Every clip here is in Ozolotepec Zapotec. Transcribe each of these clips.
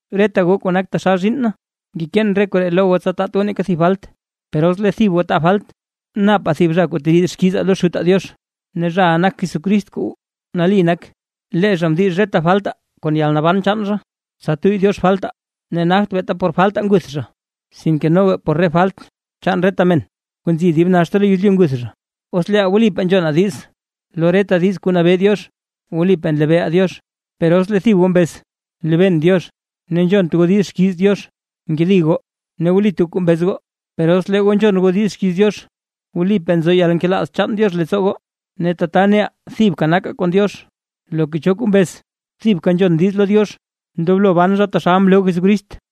Reta goo kuu nak taxal zhiinn na, ngekeen re koree lo goo tsa taat goo neeka thib falt. Per os lee thib goo taa falt, napaa thib zha kuu teriid xkiizaa lo Xutaa Diox, ne zhaʼa nak Jesucrist kuu nali nak. Lee zha mdix reta faltaa kon yalnaban chaan zha, tsa tuyy Diox faltaa; ne nagt beeta por faltaa nguth zha, sinke noga por re falt chaan reta men kuu nzi dib naxta lo yezlyu nguth zha. Os leeʼaa wlipaa nzhonaa diiz lo reta diiz kuu nabee Diox, wlipaa nlebeeʼaa Diox. Per os lee thib goo mbez: “Nlebeen Diox”, ne nzhont goo diiz xkiiz Diox, nkedi goo; ne wlit goo kuu mbez goo. Per os lee goo nzhon goo diiz xkiiz Diox, wlipaa nzo yalnkelaaz chaan Diox leettsoo goo; ne tata neʼaa thibka nakaa kon Diox. Loka cho kuu mbez: “Thibka nzhon diiz lo Diox”, ndoblo ban zha taxal mloo Jesucrist.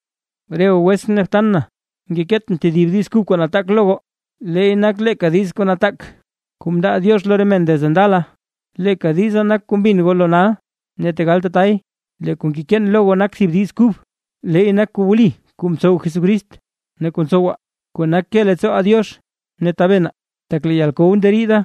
Re goo wetsʼn ne btan na, ngekeetʼn tedib diiz kub kuu nataak lo goo; leey nak leeka diiz nataak kuu mndaa Diox lo re men desde ndala. Leeka diza nak kuu mbin goo lo nal. Ne tegal tatay, lee kuu ngekeen lo goo nak thib diiz kub, leey nak kuu wli kuu mtsow Jesucrist ne kuu ntsowaa, kuu nak ke leettsooʼaa Diox ne tabenaa, tak lee yalkow na nderiida,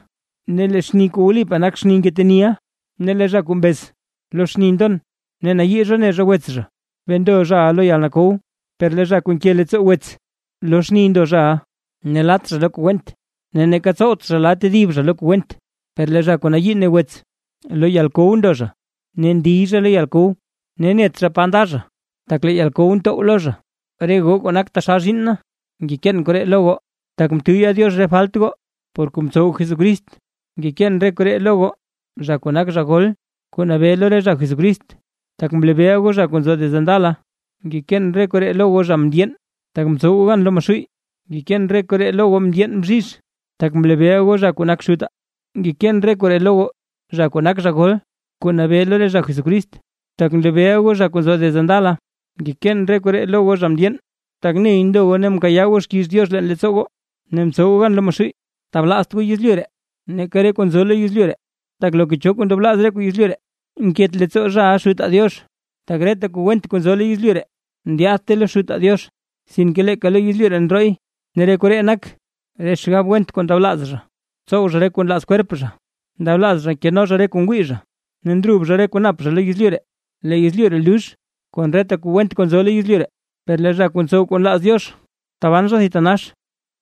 ne lee xni kuu wlipaa nak xni ngeteniʼa. Ne lee zha kuu mbez: “Lo xni ndon”, ne nayii zha ne zha wets zha, bee ndo zhaʼa lo yalkow. Per lee zha kuu nke leettsoo wets, lo xni ndo zhaʼa; ne lat zha lo kuu went, ne neeka tsowt zha la tedib zha lo kuu went. Per lee zha kuu nayii ne wets lo yalkow ndo zha ne ndiy zha lo yalkow, ne net zha naa pa nda zha, tak lee yalkow ntow lo zha. Re goo kuu nak taxal zhiinn na, ngekeen koree lo goo, tak mtuyya Diox re falt goo por kuu mtsow Jesucrist. Ngekeen re koree lo goo zha kuu nak zha gol kuu nabee lo re zha Jesucrist, tak mlebeeʼa goo zha kuu nzo desde ndala. Ngekeen re koree lo goo zha mndyeen, tak mtsow goo gan lo Maxuuy. Ngekeen re koree lo goo ndyeen bzhizh, tak mlebeeʼa goo zha kuu nak Xutaa. Ngekeen re koree lo goo zha kuu nak zha gol kuu nabee lo re zha Jesucrist, tak mlebeeʼa goo zha kuu nzo desde ndala. Ngekeen re koree lo goo zha mndyeen, tak ney ndo goo ne mkayaa goo xkiiz Diox leen leettsoo goo, ne mtsow goo gan lo Maxuuy. Tablaazt goo yezlyu ree, neeka re kuu nzo lo yezlyu ree. Tak loka cho kuu ndablaaz re kuu yezlyu ree, nket leettsoo zhaʼa Xutaa Diox; tak reta kuu went kuu nzo lo yezlyu ree, ndyaadte lo Xutaa Diox, sinke leeka lo yezlyu ree ndrooy. Ne re koree nak: Re xgab went kuu ndablaaz zha tsow zha re kuu nlaaz kwerp zha, ndablaaz zha keno zha re kuu ngwii zha, ne ndrub zha re kuu nap zha lo yezlyu ree. Lee yezlyu ree lux, kon reta kuu went kuu nzo lo yezlyu ree; per lee zha kuu ntsow kuu nlaaz Diox taban zha thitanax.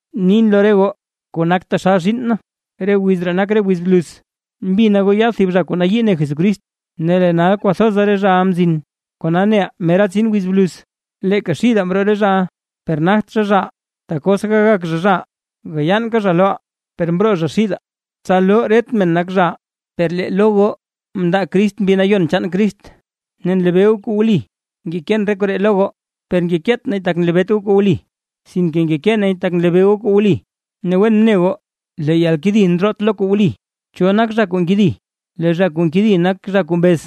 Nin lo re goo kuu nak taxal zhiinn na, re wiz ree nak re wiz bluz. Mbina goo yaad thib zha kuu yii ne Jesucrist; ne lee nal kwathoza re zhaʼa mzin, kona neʼaa mera tsin wiz bluz. Leeka xidaa mroo re zhaʼa, per nagt zha, zhaʼaa, tak os gagak zha, zhaʼaa, gayaanka zha loʼaa. Per mroo zha xidaa, tsa loo ret men nak zhaʼaa. Per lee lo goo mndaa Crist Mbi Nayon chaan Crist ne nlebee goo kuu wli. Ngekeen re koree lo goo, per ngekeet nay tak nlebeet goo kuu wli, sinke ngekee nay tak nlebeeʼa goo kuu wli, ne wen ne goo lee yalkedi ndroote lo kuu wli. ¿Cho nak zha kuu nkedi? Lee zha kuu nkedi nak zha kuu mbez,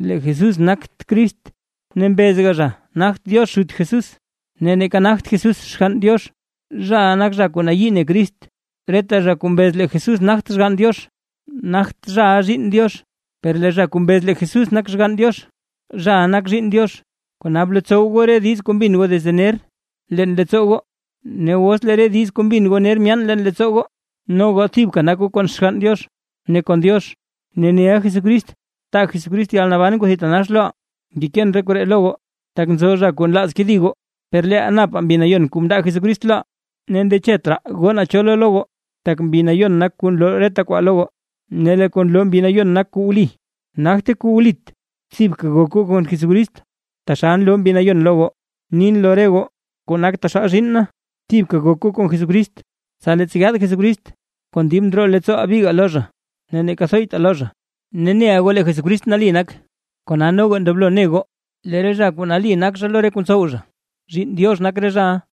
lee Jesús nagt Crist, ne mbezga zha nagt Diox Xut Jesús, ne neeka nagt Jesús Xgann Diox, zhaʼa nak zha kuu nayii ne Crist. Reta zha kuu mbez lee Jesús nagt Xgann Diox, nagt zhaʼa zhiinn Diox; per lee zha kuu mbez lee Jesús nak Xgann Diox, zhaʼa nak zhiinn Diox. Kona, blotsow goo re diiz kuu mbin goo desde ner leen leettsoo goo, ne os lee re diiz kuu mbin goo ner myaane leen leettsoo goo, no goo thibka nak goo kon Xgann Diox ne kon Diox. Ne neʼa Jesucrist taa Jesucrist yalnaban kuu thitanax loʼaa. Ngekeen re koree lo goo, tak nzo zha kuu nlaaz kedi goo. Per leeʼaa napaa Mbi Nayon kuu mndaa Jesucrist loʼaa, ne ndechet raa goo naa cho loo lo goo, tak Mbi Nayon nak kuu nloo reta kwaa lo goo, ne lee kuu nloo Mbi Nayon nak kuu wli, nagte kuu wlit. Thibka gok goo kon Jesucrist, taxal nloo Mbi Nayon lo goo. Nin lo re goo kuu nak taxal zhiinn na, thibka gok goo kon Jesucrist, tsa leettsa yaad Jesucrist, kon dib ndroo leettsooʼaa bigaa lo zha ne neeka thoytaa lo zha. Ne neʼa goo lee Jesucrist nali nak, kona noga ndoblo ne goo lee re zha kuu nali nak zha lo re kuu ntsow zha, zhiinn Diox nak re zhaʼa.